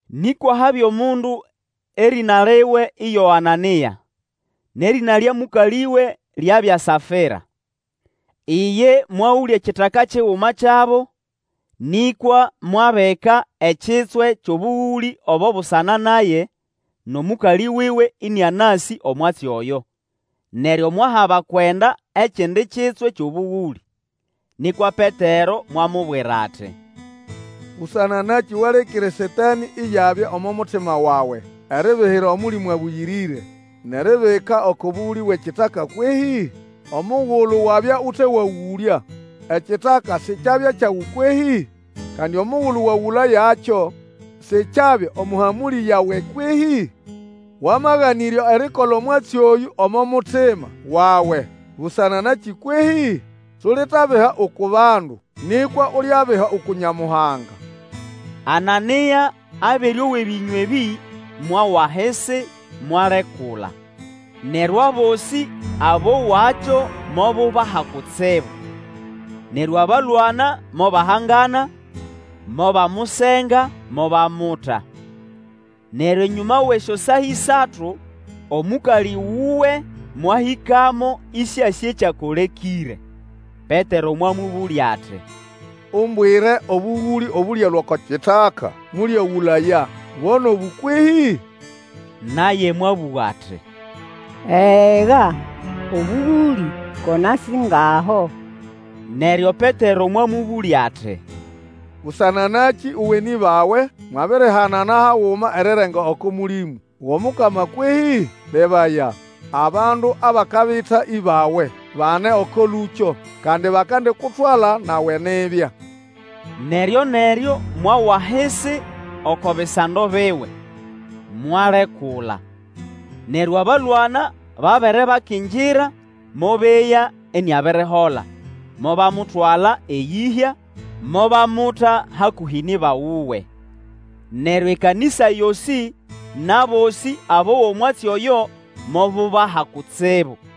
Nĩkwa habya omundu erĩna liwe iyo Anania, nʼerĩna lya mũkalĩwe lyabya Safira. Iye mwagũlya ekitaka kiguma kyabo, nĩkwa mwabika ekitswe kyʼobũgũlĩ obo busana naye, nʼomũkalĩ wuwe ĩnĩanasĩ omwatsi oyo, neryo mwaha abakwenda ekindi kitswe kyʼobũgũlĩ. Nĩkwa Petero mwamubwira ati, Busana nakĩ walekĩre Satanĩ iyabya omo mutima wawe eribihira Omũlĩmũ Abũyĩrĩre, nʼeribika oko bũgũlĩ bwʼekitaka kwehĩ? Omugulu wabya ute wagũlya ekitaka sikyabya kyawe kwehĩ? Kandi omugulu wagũlayakyo sikyabya omo hamũlĩ yawe kwehĩ? Wamaganĩrya erikola omwatsi oyũ omo mutima wawe busana nakĩ kwehĩ? Sulitabiha uku bandu, nĩkwa Ulyabiha uku Nyamuhanga! Anania abere owa ebĩnywa ebĩ, mwawa ahisi, mwalekula, neryo abosĩ abowakyo mobubaha kutsibu. Neryo abalwana mobahangana, mobamusenga, mobamuta. Neryo enyũma wʼesyosaa ĩsatu, omũkalĩ wuwe mwahĩkamo, ĩsĩasĩ ekyakolekĩre. Petero mwamũbũlya ati, Umbwire obũgũlĩ obũlyalũa oko kitaka mũlyagũlaya, bo nʼobũ kwehĩ? Naye mwabũga ati, Ega, obũgũlĩ ko na singaho. Neryo Petero mwamũbũlya ati, Busana nakĩ uwe nʼĩbawe, mwabirihanana haguma erirenga oko Mũlĩmũ wʼomukama kwehĩ? Lebaya, abandu abakabita ĩbawe bane oko lũkyo, kandi bakandikutwala nawe nibya! Neryo-neryo mwawa ahisi oko bisando biwe, mwalekula. Neryo abalwana babere bakingira mobeya iniabirihola, mobamutwala, eyĩhya, mobamuta hakũhĩ nʼĩba wuwe. Neryo ekanĩsa yosĩ, nʼabosĩ abowa omwatsi oyo mobubaha kutsibu.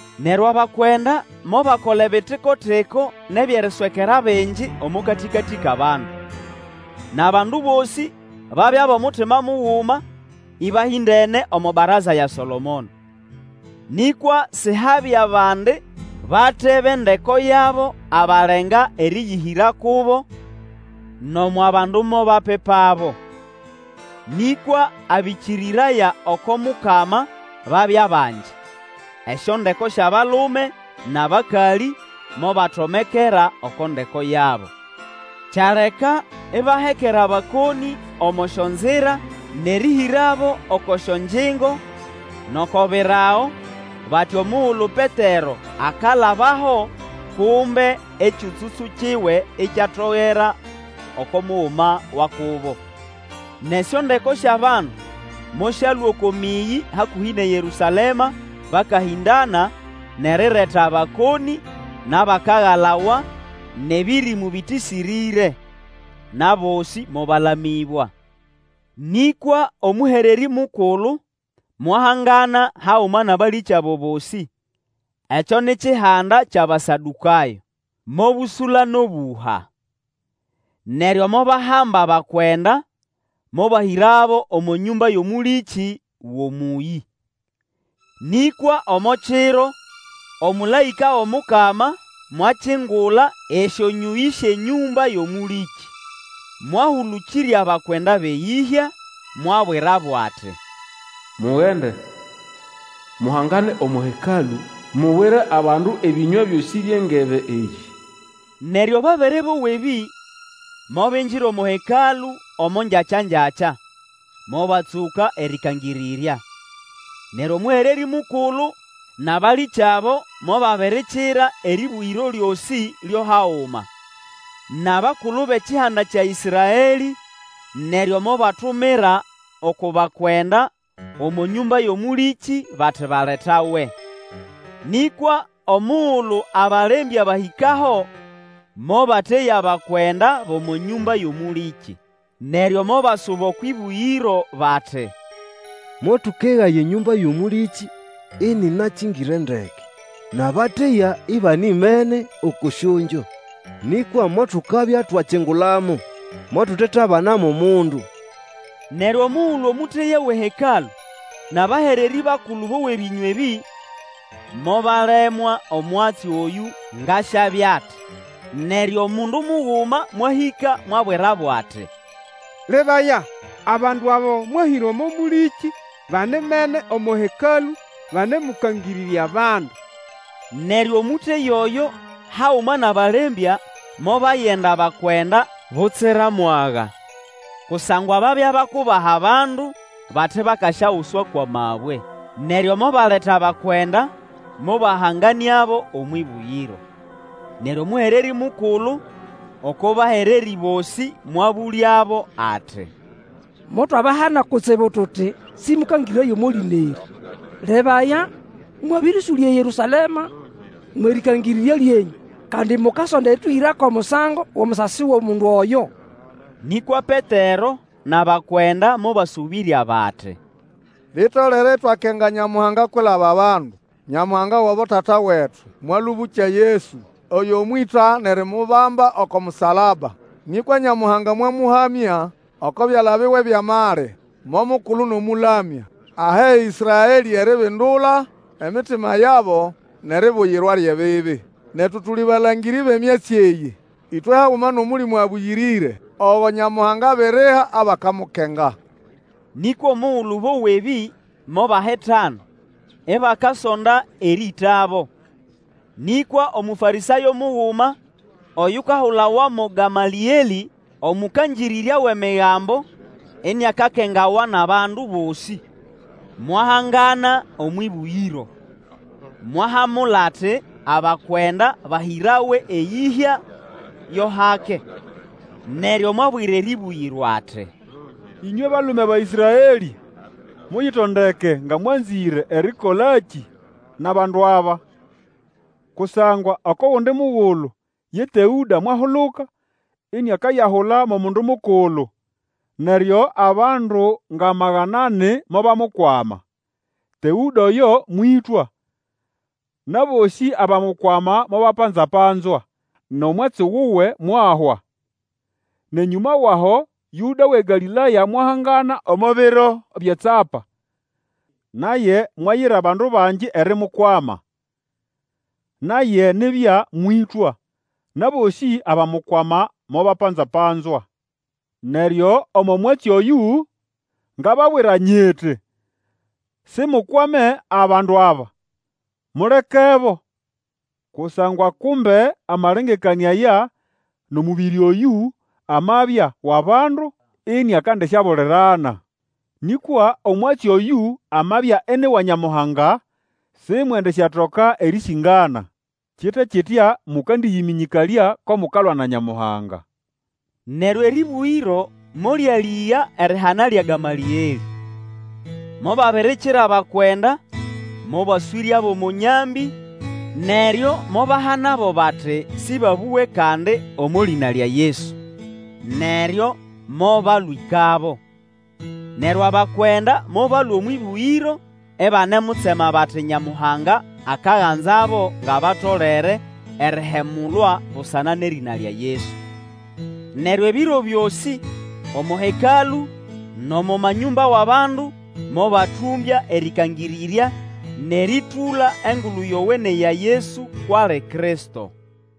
Neryo abakwenda mobakola ebitikotiko nʼebyʼeriswekera bingi omo katĩkatĩ kʼabandu. Nʼabandu bosĩ babya bʼomutima muguma ĩbahĩndene omo baraza ya Solomono. Nĩkwa sihabya bandi bate bʼendeko yabo abalenga erĩyĩhĩra kubo, nʼomo abandu mobapipabo. Nĩkwa abĩkĩrĩraya oko Mukama babya bangi, esyondeko syʼabalume nʼabakalĩ, mobatomekera oko ndeko yabo. Kyaleka ibahekera abakonĩ omo syonzira, nʼerĩhĩrabo oko syongyingo, nʼoko birago, bati omugulu Petero akalabaho, kumbe ekyũtsũtsũ kiwe ikyatogera oko muguma wa kubo. Nʼesyondeko syʼabandu mosyalũa oko mĩyĩ hakũhĩ nʼeYerũsalema bakahĩndana, nʼerireta abakonĩ nʼabakagalawa nʼebĩrĩmũ bĩtĩsĩrĩre. Nʼabosĩ mobalamĩbwa. Nĩkwa omũhererĩ mukulu, mwahangana haguma nʼabalĩkyabo bosĩ (ekyo ni kihanda kyʼAbasadũkayo), mobũsũla nʼobũha. Neryo mobahamba abakwenda mobahĩrabo omo nyũmba yʼomũlĩkĩ wʼomũyĩ. Nĩkwa omo kiro, omũlaĩka wʼomukama mwakingula esyonyũyĩ syʼenyũmba yʼomũlĩkĩ, mwahũlũkĩrya abakwenda bʼeyĩhya, mwabwirabo ati, Mugende, muhangane omo Hekalũ, mubwire abandu ebĩnywa byosĩ byʼeNgebe eyĩ. Neryo babere bowa ebĩ, mobingira omo Hekalũ omo ngyakyangyakya, mobatsũka erĩkangĩrĩrya. Neryo omũhererĩ mukulu, nʼabalĩkyabo mobabirikira erĩbũgĩro lyosĩ lyo haguma, nʼabakulu bʼekihanda kya Ĩsraelĩ, neryo mobatumira oko bakwenda omo nyũmba yʼomũlĩkĩ bati baletawe. Nĩkwa omugulu abalembya bahĩkaho, mobateya bakwenda bʼomo nyũmba yʼomũlĩkĩ. Neryo mobasuba okwʼĩbũgĩro bati, Motũkegaya enyũmba yʼomũlĩkĩ ĩnĩnakĩngĩre ndeke, nʼabateya ibanimene oko syongyo, nĩkwa motukabya twakingulamo, motutetabana mo mundu! Neryo omugulu omũteya wʼeHekalũ, nʼabahererĩ bakulu bowa ebĩnywa ebĩ, mobalemwa omwatsi oyũ ngʼasyabya ati. Neryo omundu muguma mwahĩka mwabwirabo ati, Lebaya! abandu abo mwahĩra omo mũlĩkĩ banimene omo Hekalũ banemũkangĩrĩrya bandu! Neryo omũteya oyo haguma nʼabalembya mobayenda abakwenda butsira mwaga; kusangwa babya bakubaha abandu, bati bakasyaguswa kwʼamabwe. Neryo mobaleta abakwenda mobahanganĩabo omwʼĩbũgĩro. Neryo omũhererĩ mukulu oko bahererĩ bosĩ mwabũlyabo ati, Motwabahana kutsibu tuti sĩmũkangĩrĩraye omo lĩna erĩ. Lebaya! mwabĩrĩũsũlya eYerũsalema mwʼerĩkangĩrĩrya lyenyũ, kandi mukasonda erĩtũhĩra kʼomusango wʼomusasi wʼomundu oyo. Nĩkwa Petero nʼabakwenda mobasũbĩrya bati, Litolere itwakenga Nyamuhanga kwilaba bandu. Nyamuhanga wʼabotata wetu mwalũbũkya Yesu, oyo mwĩta nʼerimubamba oko musalaba. Nĩkwa Nyamuhanga mwamũhamya oko byala biwe byʼamali mo Mukulu nʼomũlamya, ahe Ĩsraelĩ eribindula emitima yabo nʼeribuyirwa lyʼebibi. Netu tuli balangĩrĩ bʼemyatsi eyĩ, ĩtwe haguma nʼOmũlĩmũ Abũyĩrĩre, ogo Nyamuhanga abiriha abakamukenga. Nĩkwa omugulu bowa ebĩ, mobahitana ibakasonda erĩĩtabo. Nĩkwa Omũfarĩsayo muguma oyukahulawa mo Gamalĩelĩ, omũkangĩrĩrya wʼEmigambo, iniakakengawa nʼabandu bosĩ, mwahangana omwʼĩbũgĩro, mwahamula ati abakwenda bahĩrawe eyĩhya yo hake. Neryo mwabwira erĩbũgĩro ati, Ĩnywe balume ba Ĩsraelĩ, muyitondeke nga mwanzĩre erikolakĩ nʼabandu aba. Kusangwa oko gundi mugulu ye Teũda mwahuluka iniakayahula mo mundu mukulu. Neryo abandu nga magana ani mobamukwama. Teũda oyo mwĩtwa, nʼabosĩ abamukwama mobapanza-panzwa, nʼomwatsi wuwe mwahwa. Nʼenyũma wʼaho Yũda wʼeGalĩlaya mwahangana omo biro byʼetsapa. Naye mwayira abandu bangi erimukwama. Naye nibya mwĩtwa, nʼabosĩ abamukwama mobapanza-panzwa. Neryo omo mwatsi oyũ, ngababwira nyiti, simukwame abandu aba, mulekebo. Kusangwa kumbe amalengekanĩa aya nʼomũbĩrĩ oyũ, amabya wʼabandu, iniakandisyabulirana. Nĩkwa omwatsi oyũ amabya ini wa Nyamuhanga, simwendisyatoka erĩsĩngana. Kite kitya mũkandĩyĩmĩnyĩkalya ko mukalwa na Nyamuhanga. Neryo erĩbũgĩro molyalĩga erihana lya Gamalĩelĩ. Mobabirikira abakwenda, mobaswĩryabo omo nyambĩ, neryo mobahanabo bati sĩbabũge kandi omo lĩna lya Yesu, neryo mobalwĩkabo. Neryo abakwenda mobalũa omwʼĩbũgĩro ibanemutsema bati Nyamuhanga akaganzabo ngʼabatolere erihemulwa busana nʼerĩna lya Yesu. Neryo ebiro byosĩ, omo Hekalũ nʼomo manyũmba wʼabandu, mobatũmbya erĩkangĩrĩrya nʼerĩtũla Engulu Yowene ya Yesu kwʼali Kristo.